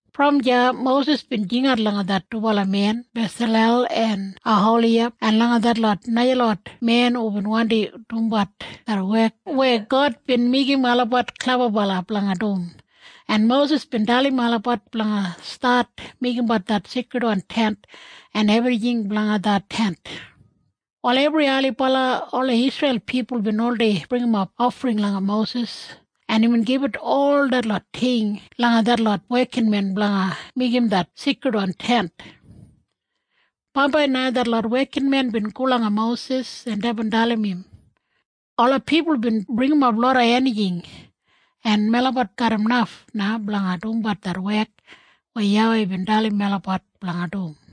Brom deya Mosis bin jingat langa det dubala men Besalel en Oholiyab en langa detlot najalot men hubin wandi dumbat det wek weya God bin meigim olabat klebabala blanga dum, en Mosis bin dalim olabat blanga stat meigimbat det Seikridwan Tent en ebrijing blanga det Tent. Wal ebri ailibala ola Isreil pipul bin oldei bringimap ofring langa Mosis, en imbin gibit ol detlot ting langa detlot wekinmen blanga meigim det Seikridwan Tent. Bambai na detlot wekinmen bin go langa Mosis, en deibin dalim im, “Ola pipul bin bringimap loda enijing, en melabat garram naf na blanga dumbat det wek weya YAWEI bin dalim melabat blanga dum.”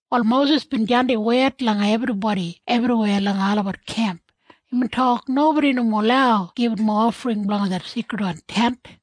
Wal Mosis bin jandim wed langa ebribodi ebriweya langa olabat kemp. Imbin tok, “Nobodi nomo lau gibit mowa ofring blanga det Seikridwan Tent.”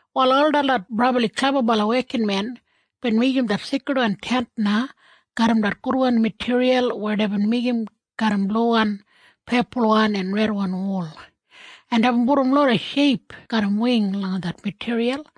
Wal ol detlot brabli klebabala wekinmen bin meigim det Seikridwan Tent na garram det gudwan matiriyal weya deibin meigim garram bluwan, pepulwan en redwan wul, en deibin pudum loda sheip garram wing langa det matiriyal.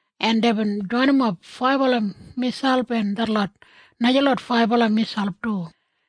en deibin joinimap faibala miselp en detlot najalot faibala miselp du.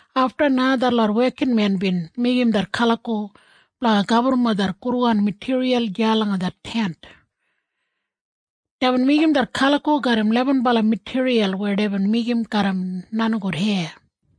Afta na detlot wekinmen bin meigim det kaliko blanga gaburrumap det gudwan matiriyal deya langa det Tent. Deibin meigim det kaliko garram lebenbala matiriyal weya deibin meigim garram nenigout heya.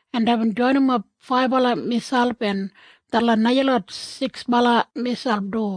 en deibin joinimap faibala miselp en detlot najalot siksbala miselp du.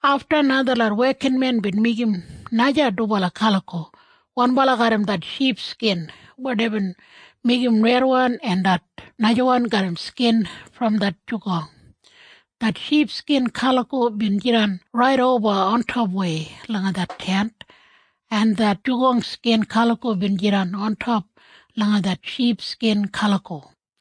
Afta na detlot wekinmen bin meigim naja dubala kaliko, wanbala garram det ship skin weya deibin meigim redwan en det najawan garram skin brom det nenigout. Det ship skin kaliko bin jidan raidoba ontopwei langa det Tent, en det nenigout skin kaliko bin jidan ontop langa det ship skin kaliko.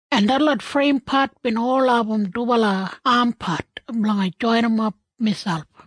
en detlot freimpat bin ol abum dubala ampat blanga joinimap miselp.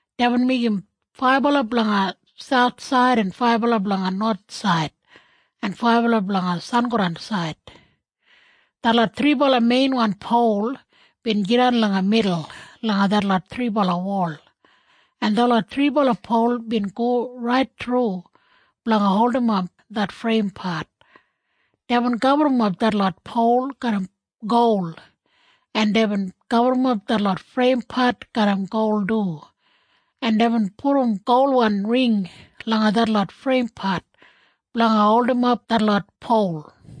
Deibin meigim faibala blanga sauthsaid en faibala blanga nowathsaid en faibala blanga sangodansaid. Detlot thribala meinwan pol bin jidan langa midul langa detlot thribala wol, en detlot thribala pol bin go rait thru blanga holdimap det freimpat. Deibin gaburrumap detlot pol garram gol, en deibin gaburrumap detlot freimpat garram gol du, en deibin pudum golwan ring langa detlot freimpat blanga holdimap detlot pol.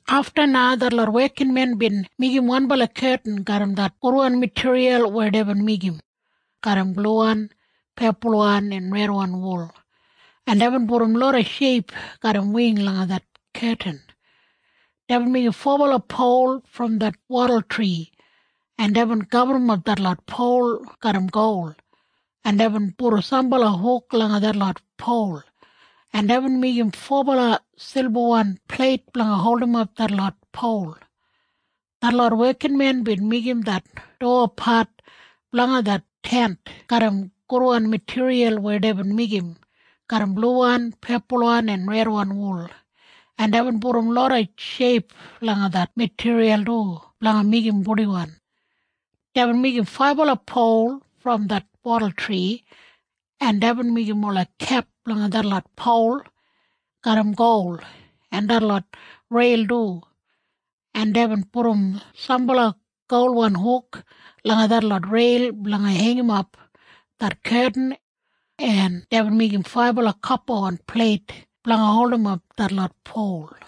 Afta na detlot wekinmen bin meigim wanbala ketin garram det gudwan matiriyal weya deibin meigim garram bluwan, pepulwan en redwan wul, en deibin pudum loda sheip garram wing langa det ketin. Deibin meigim fobala pol brom det wadultri, en deibin gaburrumap detlot pol garram gol, en deibin pudum sambala huk langa detlot pol, en deibin meigim fobala silbawan pleit blanga holdimap detlot pol. Detlot wekinmen bin meigim det dowapat blanga det Tent garram gudwan matiriyal weya deibin meigim garram bluwan, pepulwan en redwan wul, en deibin pudum loda sheip langa det matiriyal du blanga meigim purdiwan. Deibin meigim faibala pol brom det wadultri, en deibin meigim ola kep blanga detlot pol garram gol, en detlot reil du, en deibin pudum sambala golwan huk langa detlot reil blanga heingimap det ketin, en deibin meigim faibala kopawan pleit blanga holdimap detlot pol.